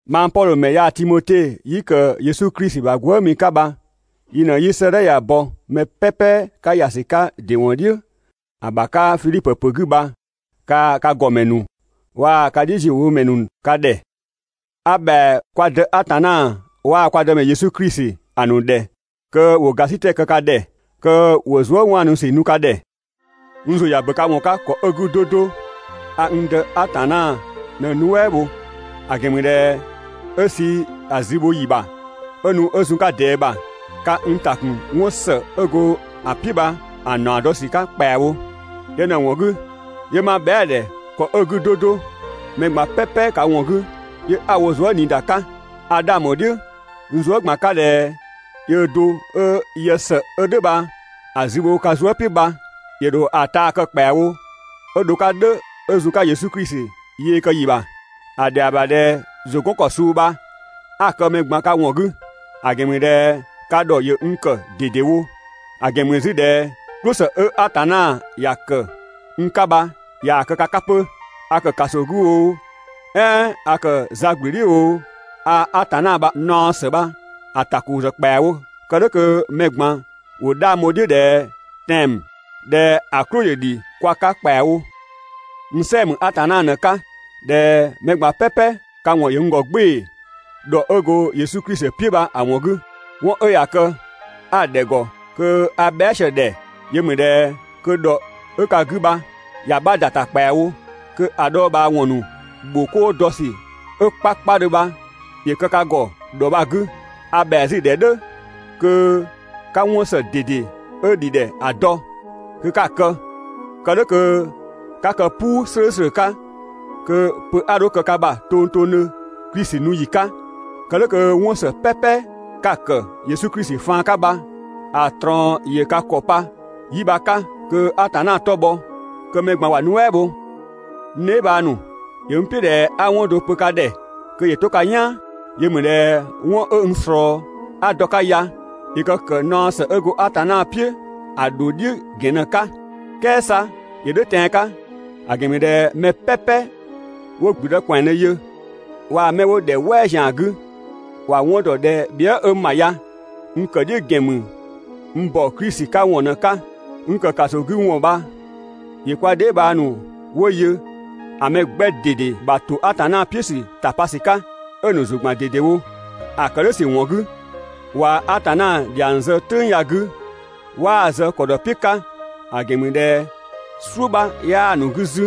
Mang Pɔdhö ‑mɛ yaa‑ Timote 'yi ‑kë Yesu Klisi ‑bha gwëëmi 'ka bha yi ꞊në 'yi 'sëëdhɛ ya‑ bɔ, mɛ "pɛpɛ 'ka ‑ya ‑sü 'ka ‑dɩ ‑wɔn "dhiʋ̈‑ ‑bha 'ka Fidhipö ‑pö 'gü bha, kaa‑ ka ‑gɔmɛ ‑nu waa‑ ka "dhiʋ̈ziöwomɛ ‑nu ka ‑dhɛ. A ‑bhɛa kwa Dë Atanna waa‑ kwa Dëmɛ Yesu Klisi ‑a ‑nu ‑dhɛ kö ‑wo ‑gasitɛ kë ka ‑dhɛ, kö ‑wo zuëwaanusü nu ka ‑dhɛ! N ‑zʋ ‑ya ‑bö ka ‑wɔn 'ka ‑kɔ 'ö‑ 'gü 'do 'do, a (n Dë) Atanna ꞊në‑ nuɛ" ‑bho, ‑a ‑gɛn ‑mü ꞊dhɛ 'ö sü‑ zü bho ‑yi bha 'ö nu 'ö zun‑ 'ka ꞊dɛɛ ‑bha, ka n ‑ta ‑kun 'wɔn ‑së 'ö go‑ "piʋ̈‑ bha‑ ‑naɔ dɔ ‑sü ‑bha ‑kpɛawo. Yö ꞊në‑ ‑wɔn 'gü 'yö 'ma bhɛa"‑ ‑dhɛ ‑kɔ 'ö‑ 'gü 'do 'do, mɛ ꞊gban "pɛpɛ ka ‑wɔn 'gü, 'yö 'a‑ wo zuëniida 'ka. A 'dhang ‑bho "dhiʋ̈ n zuë" ꞊gban 'ka ꞊dhɛ yöö do 'ö yë ‑së 'ö "dhʋ̈ bha‑ zü bho ka zuë" "piʋ̈ bha, ‑yö ‑dho ‑a taa kë ‑kpɛawo 'ö dho‑ 'ka "dhʋ̈ 'ö zun‑ 'ka Yesu Klisi yee kë ‑yi ‑bha. ‑A ‑dhɛa ‑bha ꞊dhɛ ‑zʋ 'gɔn ‑kɔ suu bha 'a‑ kë mɛ ꞊gban ka ‑wɔn 'gü, ‑a ‑gɛn ‑mü ꞊dhɛ ka ‑dhɔ ‑yö n ‑kë ꞊dedewo, ‑a ‑gɛn ‑mü 'zü ꞊dhɛ "klʋsë 'ö Atanna ‑ya ‑kë n 'ka bha ꞊yaa‑ kë ka 'ka 'pö. A ‑kë ‑kaso 'gü oo, "ɛɛn a ‑kë za ꞊gblü "dhiʋ̈ oo, a Atanna ‑bha naɔ ‑së bha‑ ‑takozë ‑kpɛawo kë "dhʋ̈ kö mɛ ꞊gban ‑wo 'dhang bho‑ "dhiʋ̈ ꞊dhɛ tɛan‑ ‑mü. ꞊Dhɛ ‑a "klʋ ‑yö ‑dhi kwa 'ka ‑kpɛawo. N "sɛɛ‑ ‑mü Atanna ꞊në‑ 'ka, ꞊dhɛ mɛ ꞊gban "pɛpɛ ka ‑wɔn ‑yö n ‑gɔ "gbɩɩ‑ ‑dhɔ 'ö go Yesu Klisi "piʋ̈ bha‑ ‑wɔn 'gü. 'Wɔn 'ö ꞊ya kë 'a‑ ‑dhɛ ‑gɔ kö a bhɛa" sië‑ ‑dhɛ, yö ‑mü ꞊dhɛ kö ‑dhɔ 'ö ka 'gü bha ‑ya 'bha ‑da ‑ta ‑kpɛawo, kö ‑a dhɔɔbhaawɔn ‑nu ‑bho 'koo dɔ ‑sü 'ö 'kpakpadhö bha ‑yö kë ka ‑gɔ ‑dhɔ bha‑ 'gü. A ‑bhɛa 'zü "dhʋ̈ kö 'ka 'wɔn ‑së ꞊dede 'ö ‑dhi ‑dhɛ ‑a dɔ, kö 'ka‑ kë, kë "dhʋ̈ kö 'ka kë "puu "slʋ̈ʋ̈slʋ̈ 'ka, kö pö 'a 'dho kë ka ‑bha tongtongdhö Klisi nu ‑yi 'ka. Kë "dhʋ̈ kö 'wɔn ‑së "pɛpɛ 'ka‑ ‑kë Yesu Klisi faan 'ka bha‑ ꞊trɔɔn‑ ka ‑kɔ pa 'yi bha‑ 'ka, kö Atanna 'tɔ‑ bhɔ, kö mɛ ꞊gban ‑wa nuɛ" bho. N dheebhang ‑nu, ‑yö n "piʋ̈ ꞊dhɛ 'a 'wɔn do pö ka ‑dhɛ kö ‑yö 'to ka "yaan. Yö ‑mü ꞊dhɛ 'wɔn 'ö n ꞊slɔɔ 'a dɔ‑ 'ka ya ‑yö kë ‑kë naɔ ‑së 'ö go Atanna "piʋ̈ ‑a ‑dho "dhiʋ̈ ‑gɛn ꞊në‑ 'ka. "Kɛɛ 'sa ‑yö "dhʋ̈ tɛan‑ 'ka, ‑a ‑gɛn ‑mü ꞊dhɛ mɛ "pɛpɛ 'wo ‑gblüdë ‑kwɛandhö yö waa‑ 'mɛ 'wo ‑dhɛ "wɛɛ ‑zian 'gü, ‑wa 'wɔn ‑dɔ ꞊dhɛ bhië" 'ö n ‑bha ya, n ‑kë "dhiʋ̈ ‑gɛn ‑mü n ‑bɔ Klisi 'ka ‑wɔn ꞊në‑ 'ka. N ‑kë ‑kaso 'gü ‑wɔn bha ‑yö kwa dheebhang ‑nu 'wo yö ‑a mɛ 'gbɛ ꞊dede ‑bha ‑to Atanna "piʋ̈ ‑sü ‑tapa ‑sü 'ka, 'ö‑ ‑nu ‑zʋ ‑gban ꞊dedewo. ‑A ‑kë "dhʋ̈ ‑sü ‑wɔn 'gü, ꞊wa Atanna ‑dhiang zë "tʋ̈ng ya‑ 'gü 'waa‑ zë ‑kɔ dɔ "piʋ̈ 'ka, ‑a ‑gɛn ‑mü ꞊dhɛ "suʋ̈ 'bha 'yaa‑ ‑nu 'gü 'zü.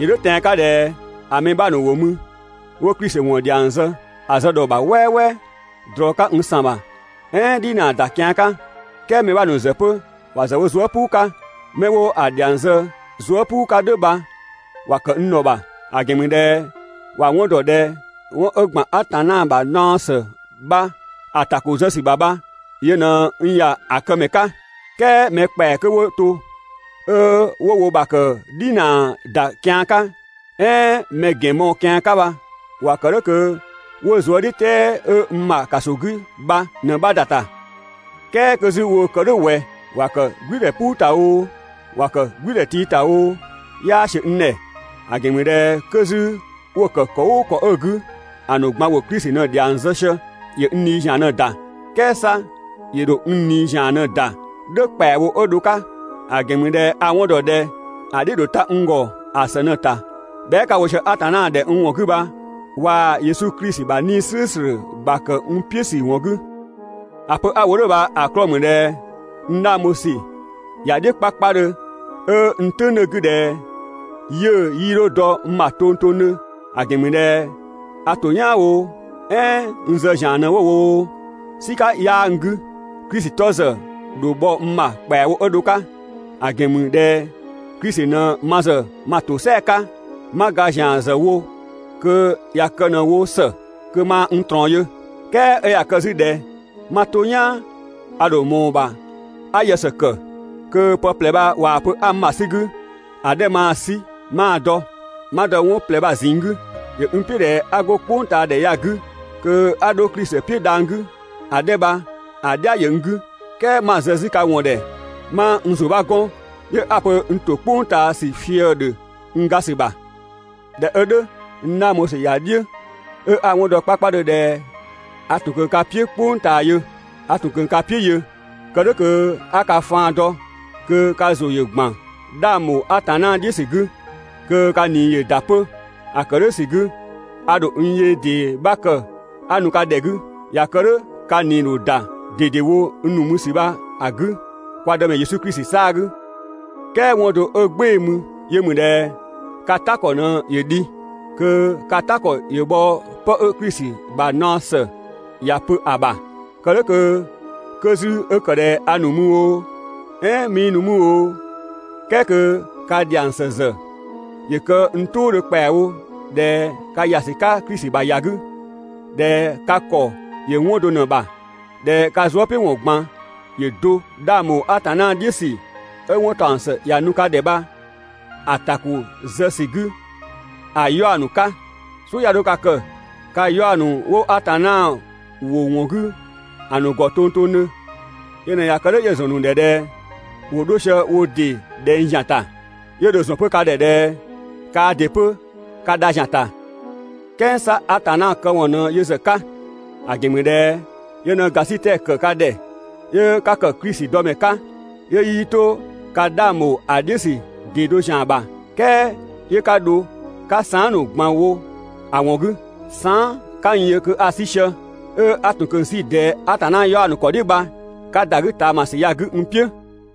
‑Yö "dhʋ̈ tɛan‑ 'ka ꞊dhɛ ‑a mɛ 'bha ‑nu ‑wo mü 'wo Klisi ‑wɔn ‑dhiang zë‑ zë ‑dhɔ ‑bha "wɛɛwɛɛ, ꞊drɔ 'ka (n ‑san ‑bha), "ɛɛn "dhinaa ‑da kian 'ka. "Kɛɛ mɛ 'bha ‑nu ‑zë 'pö ‑wa ‑zë wo zuë" "puu 'ka. 'Mɛ 'wo‑ ‑dhiang zë zuë" "puu 'ka "dhʋ̈ bha ‑wa ‑kë n ‑dhɔ ‑bha, ‑a ‑gɛn ‑mü ꞊dhɛ ‑wa 'wɔn dɔ ꞊dhɛ 'wɔn 'ö ‑gban Atanna ‑bha naɔ ‑së bha‑ ‑takozë ‑sü ‑bha bha yö ꞊në n ‑ya ‑a këmɛ 'ka, "kɛɛ mɛ ‑kpɛa 'kö 'wo to 'ö 'wo wo ‑bha ‑kë "dhinaa ‑da kian 'ka, "ɛɛn mɛ ‑gɛn mɔɔ‑ kian 'ka bha ‑wa ‑kë "dhʋ̈ kö 'wo zuëdhiʋ̈tɛɛ 'ö n ‑bha ‑kaso 'gü bha ꞊në‑ 'bha ‑da ‑ta. "Kɛɛ 'kö 'zü woo‑ kë "dhʋ̈ ꞊wɛ? ‑Wa ‑kë "gblʋ̈ʋ̈dhɛ "puu ‑ta oo, ‑wa ‑kë "gblʋ̈ʋ̈dhɛ tii ‑ta oo, 'yaa ‑siö n ‑dhɛ, ‑a ‑gɛn ‑mü ꞊dhɛ 'kö 'zü 'wo‑ ‑kë ‑kɔ "ʋʋ ‑kɔ 'ö‑ 'gü, ‑a ‑nu ꞊gban ‑wo Klisi ꞊në‑ ‑dhiang zë sië, ‑yö n ꞊nii ‑zian ꞊në‑ ‑da, "kɛɛ 'sa ‑yö ‑dho n ꞊nii ‑zian ꞊në‑ ‑da "dhʋ̈ ‑kpɛawo 'ö dho‑ 'ka. ‑A ‑gɛn ‑mü ꞊dhɛ a‑ 'wɔn ‑dɔ ꞊dhɛ ‑a "dhiʋ̈‑ ‑dho ta n ‑gɔ ‑a ‑së ꞊në‑ ‑ta bhɛa" 'ka‑ wo sië Atanna ‑dhɛ n ‑wɔn 'gü bha waa‑ Yesu Klisi ‑bha 'Nii‑ "slʋ̈ʋ̈slʋ̈ ‑bha ‑kë n "piʋ̈ ‑sü ‑wɔn 'gü. ‑A pö 'a‑ wo "dhʋ̈ bha‑ 'klɔɔ‑ ‑mü ꞊dhɛ n 'dhang bho ‑sü ‑ya "dhiʋ̈ 'kpakpadhö 'ö n "tʋ̈ng 'dhö‑ 'gü ꞊dhɛ 'yiʋ̈‑ 'yii 'dho dɔ n ‑bha tongtongdhö, ‑a ‑gɛn ‑mü ꞊dhɛ a ‑to "yaan oo, "ɛɛn 'ö n zë ‑zian ꞊në 'wo‑ wo oo, "sika 'yaa n 'gü, Klisi 'tɔ ‑zë ‑dho bhɔ n ‑bha ‑kpɛawo 'ö dho‑ 'ka. ‑A ‑gɛn ‑mü ꞊dhɛ Klisi ꞊në ma ‑zë ma ‑tosɛa 'ka, 'ma ga ‑zian ‑zë wo kö ꞊ya kë ꞊në‑ wo ‑së, kö maa n ꞊trɔɔn yö. "Kɛɛ 'ö ꞊ya kë 'zü ꞊dhɛ 'ma 'to "yaan 'a dho ꞊mɔɔ‑ ‑bha 'a yë ‑së ‑kë, kö pë ꞊plɛ bha ꞊waa‑ pö 'a n ‑bha 'sü‑ 'gü, ‑a 'dhɛ maa‑ 'sü 'maa‑ dɔ. 'Ma dɔ 'wɔn ꞊plɛ bha‑ ꞊zinng 'gü. ‑Yö n "piʋ̈ ꞊dhɛ 'a 'go "kpʋngtaadhɛ ya‑ 'gü kö 'a 'dho Klisi "piʋ̈ dhang‑ 'gü, ‑a 'dhɛ bha‑ "dhia ‑yö n 'gü, "kɛɛ 'ma zë 'zü ka ‑wɔn ‑dhɛ, 'ma n ‑zʋ 'bha 'gɔn, 'yö 'a‑ pö n ‑to "kpʋng ꞊taa ‑sü fië‑ ‑dhö n ga ‑sü ‑bha. ꞊Dhɛ 'ö "dhʋ̈, n 'dhang bho ‑sü ‑za "dhiʋ̈ 'ö 'a‑ 'wɔn dɔ 'kpakpadhö ꞊dhɛ a ‑tun kö ka "piʋ̈ "kpʋng ꞊taa yö, a ‑tun kö ka "piʋ̈ yö kë "dhʋ̈ kö 'a ka faan dɔ kö ka ‑zʋ ‑yö ‑gban 'dhang ‑bho Atanna "dhiʋ̈ ‑sü 'gü, kö ka ꞊nii ‑yö ‑da 'pö. ‑A ‑kë "dhʋ̈ ‑sü 'gü, a ‑dho n yee ‑dee 'bha kë 'a nu ka ‑dhɛ 'gü. ꞊Ya kë "dhʋ̈ ka ꞊nii‑ ‑dho ‑da ꞊dedewo n nu mü ‑sü bha‑ 'gü kwa Dëmɛ Yesu Klisi 'saa‑ 'gü. "Kɛɛ 'wɔn do 'ö "gbɩɩ‑ mü, yö ‑mü ꞊dhɛ ka "ta ‑kɔ ꞊në ‑yö dhi, kö ka "ta ‑kɔ ‑yö bhɔ 'pë 'ö Klisi ‑bha naɔ ‑së ‑ya pö ‑a ‑bha. Kë "dhʋ̈ kö, 'kö 'zü 'ö ‑kë ꞊dhɛ a ‑nu mü oo, "ɛɛn 'mii nu mü oo, "kɛɛ kö ka ‑dhiang ‑së ‑zë ‑yö kë n "tʋʋdhö ‑kpɛawo ꞊dhɛ ka ‑ya ‑sü 'ka Klisi ‑bha ‑ya 'gü, ꞊dhɛ ka ‑kɔ ‑yö 'wɔn do ꞊në‑ ‑bha, ꞊dhɛ ka zuëpiʋ̈wɔn ꞊gban ‑yö do 'dhang ‑bho Atanna "dhiʋ̈ ‑sü 'ö 'wɔn ‑taɔng ‑së ‑ya nu ka ‑dhɛ bha‑ ‑takozë ‑sü 'gü ‑a 'yaɔ‑ ‑nu 'ka. "Suʋ̈ 'ya 'dho ka kë ka 'yaɔ‑ ‑nu 'wo Atanna ‑wʋ ‑wɔn 'gü ‑a ‑nu ‑gɔ tongtongdhö. Yö ꞊në ꞊ya kë "dhʋ̈ 'yö‑ ‑zɔn ‑nu ‑dhɛ ꞊dhɛ ‑wo 'dho sië wo ‑dɩ ꞊dhɛng ‑zian ‑ta, 'yö dho‑ ‑zɔn 'pö ka ‑dhɛ ꞊dhɛ kaa ‑dɩ 'pö ka dha ‑zian ‑ta. "Kɛɛ 'sa Atanna këwɔn ꞊në yö ‑zë 'ka, ‑a ‑gɛn ‑mü ꞊dhɛ yö ꞊në ‑gasitɛ ‑kë ka ‑dhɛ 'yö ka ‑kë Klisi dɔmɛ 'ka, 'yö 'yii 'to ka 'dhang ‑bho ‑a "dhiʋ̈ ‑sü ‑dɩ do ‑zian ‑bha, "kɛɛ 'yö 'ka dho 'ka saan" ‑nu ꞊gban wo ‑a ‑wɔn 'gü. Saan" 'ka n yö kö a‑ 'sü sië, 'ö 'a ‑tun ꞊kö 'sü ꞊dɛɛ Atanna 'yaɔ‑ ‑nu ‑kɔ "dhiʋ̈ bha 'ka ‑da 'gü ꞊taamasü ya‑ 'gü n "piʋ̈.